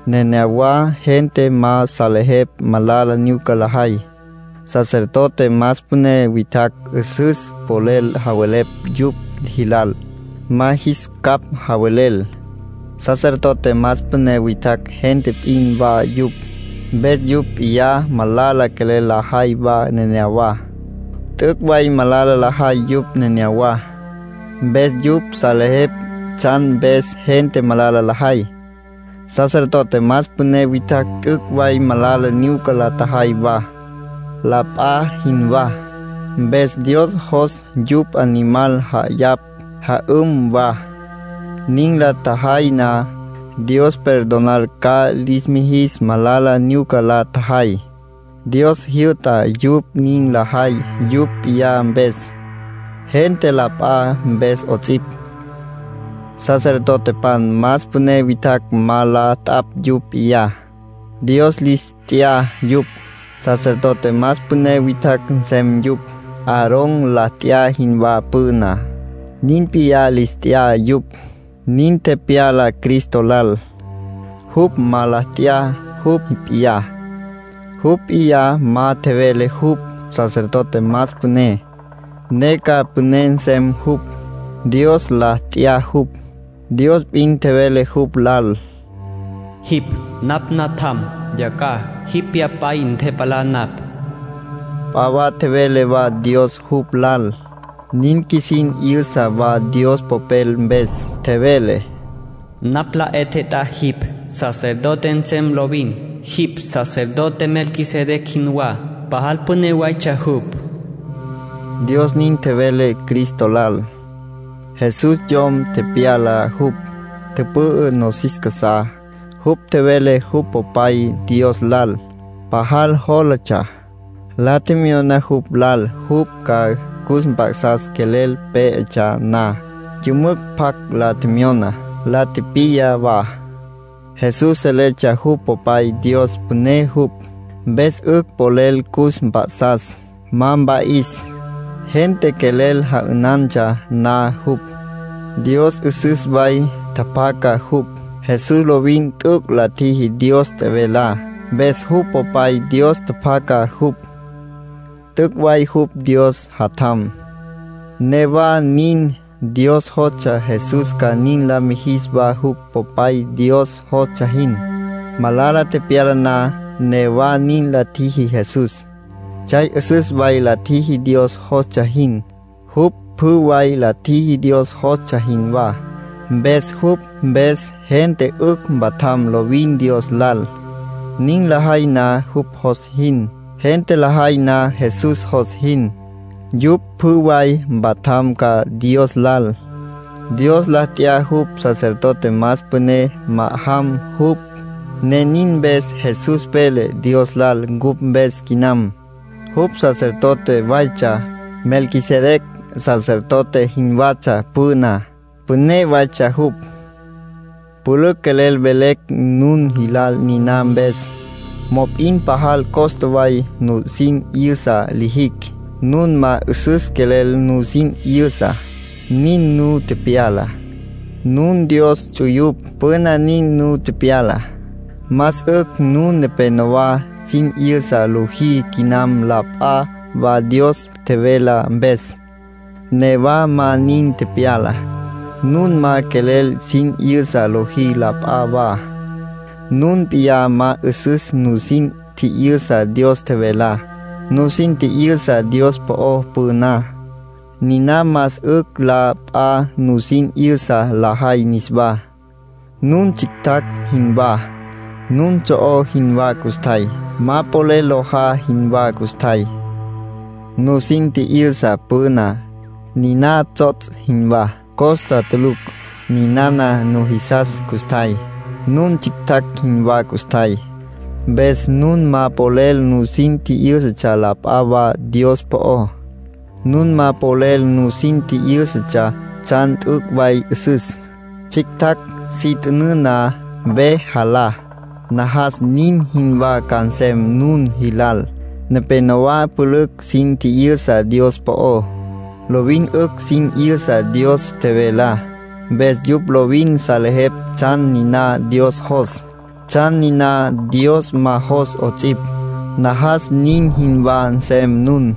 Nenéyawa gente ma salejepj malala nyuca lajay. Sacerdote más püné witjacj 'üsüs polel javelepj yupj jilal, ma jis capj javelel; sacerdote más püné witjacj gente p'in wa yupj, mpes yupj p'iyá malala quelel lajay wa neneyawá. T'üc' way malala lajay yupj neneyawá. Mpes yupj salejepj tsjan mpes gente malala lajay. Sacerdote más püné witjacj t'üc' way malala nyuca la tjajay wa, la p'a jinwá. Mpes Dios jos yupj animal ja'ayapj, ja'üm wa. Nin la tjajay na, Dios perdonar ca lis mijis malala nyuca la tjajay. Dios jyü'ta yupj nin lajay yupj p'iyá mpes, gente la p'a mpes 'ots'ipj. Sacerdotepan más püné witjacj ma la t'apj yupj p'iyá. Dios lis t'ya yupj, sacerdote más püné witjacj nsem yupj. Aarón la t'ya jinwá püná, nin p'iyá lis t'ya yupj. Nin tepyala Cristo lal. Jupj ma la t'ya jupj p'iyá. Jupj p'iyá ma tjevele jupj sacerdote más püné, ne ca püné nsem jupj. Dios la t'ya jupj. Dios p'in tjevele jupj lal: “Jipj napj Natjam. Yacjaj jipj Pyapay ntepalá napj.” P'a wa tjevele wa Dios jupj lal, nin qjuisin 'yüsa wa Dios Popel mpes. Tjevele: “Napj la 'e tjet'á jipj, sacerdote nsem lovin. Jipj sacerdote Melquisedec jinwá, pajal püné waytsja jupj.” Dios nin tjevele Cristo lal. Jesús yom tepyala jupj, tüpü'ü nosis casá. Jupj tjevele jupj Popay Dios lal. Pajal jólatsja, la tjemyona jupj lal jupj ca cus mp'a'sas quelel pé'etsja na. Yümücj pjac la tjemyona, la tipiya wa. Jesús seletsja jupj Popay Dios püné jupj, mpes 'ücj polel cus mp'a'sas, ma mpa'is, gente quelel ja'ünantsja na jupj. Dios 'üsüs way tjapjaca jupj. Jesús lovin t'üc' la tjiji Dios tjevelá, mpes jupj Popay Dios tjapjaca jupj. T'üc' way jupj Dios Jatjam. Newa nin, Dios jostsja Jesús ca nin la mijis wa jupj Popay Dios jostsja jin. Malala tepyala na, newa nin la tjiji Jesús. Tsjay 'üsüs way la tjiji Dios jostsja jin. Jupj pjü way la tjiji Dios jostsja jinwá. Mpes jupj mpes gente 'ücj mpatjam lovin Dios lal, nin lajay na jupj jos jin. Gente lajay na Jesús jos jin, yupj pjü way mpatjam ca Dios lal. Dios la t'ya jupj sacerdote más püné ma'ajam jupj, ne nin mpes Jesús vele Dios lal cupj mpes quinam. Jupj sacerdote waytsja, Melquisedec sacerdote jinwatsja püná; püné waytsja jupj. Pülücj quelel velecj nun jilal niná mpes. Mop'in pajal costa way nusin 'yüsa lijicj; nun ma 'üsüs quelel nusin 'yüsa, nin nu tepyala. Nun Dios ts'uyupj; püna nin nu tepyala. Más 'ücj nun nepenowá sin 'yüsa lojí quinam la p'a wa Dios tjevelá mpes. Newa ma nin tepyala. Nun ma quelel sin 'yüsa lojí la p'a wa; nun p'iyá ma 'üsüs nusin tji'yüsa Dios tjevelá. Nusin tji'yüsa Dios po'ó püná, niná más 'ücj la p'a nusin 'yüsa lajay niswá. Nun tsjictjacj jinwá, nun tso'ó jinwá custjay. Ma polel lojá jinwá custjay. Nusin tji'yüsa püná, niná tsots' jinwá, costa tulucj. Ninana nujisas custjay, nun tsjictjacj jinwá custjay. Mpes nun ma polel nusin tji'yǘsatsja la p'a wa Dios po'ó. Nun ma polel nusin tji'yǘsatsja tsjan t'üc' way 'üsüs. Tsjictjacj si t'ünǘ na, ve jalá. Najas nin jinwá ca nsem nun jilal. Nepénowa pülücj sin tji'yüsa Dios po'ó. Lovin 'ücj sin 'yüsa Dios tjevelá. Mpes yupj lovin salejepj tsjan niná Dios jos, tsjan niná Dios ma jos 'ots'ipj. Najas nin jinwá nsem nun.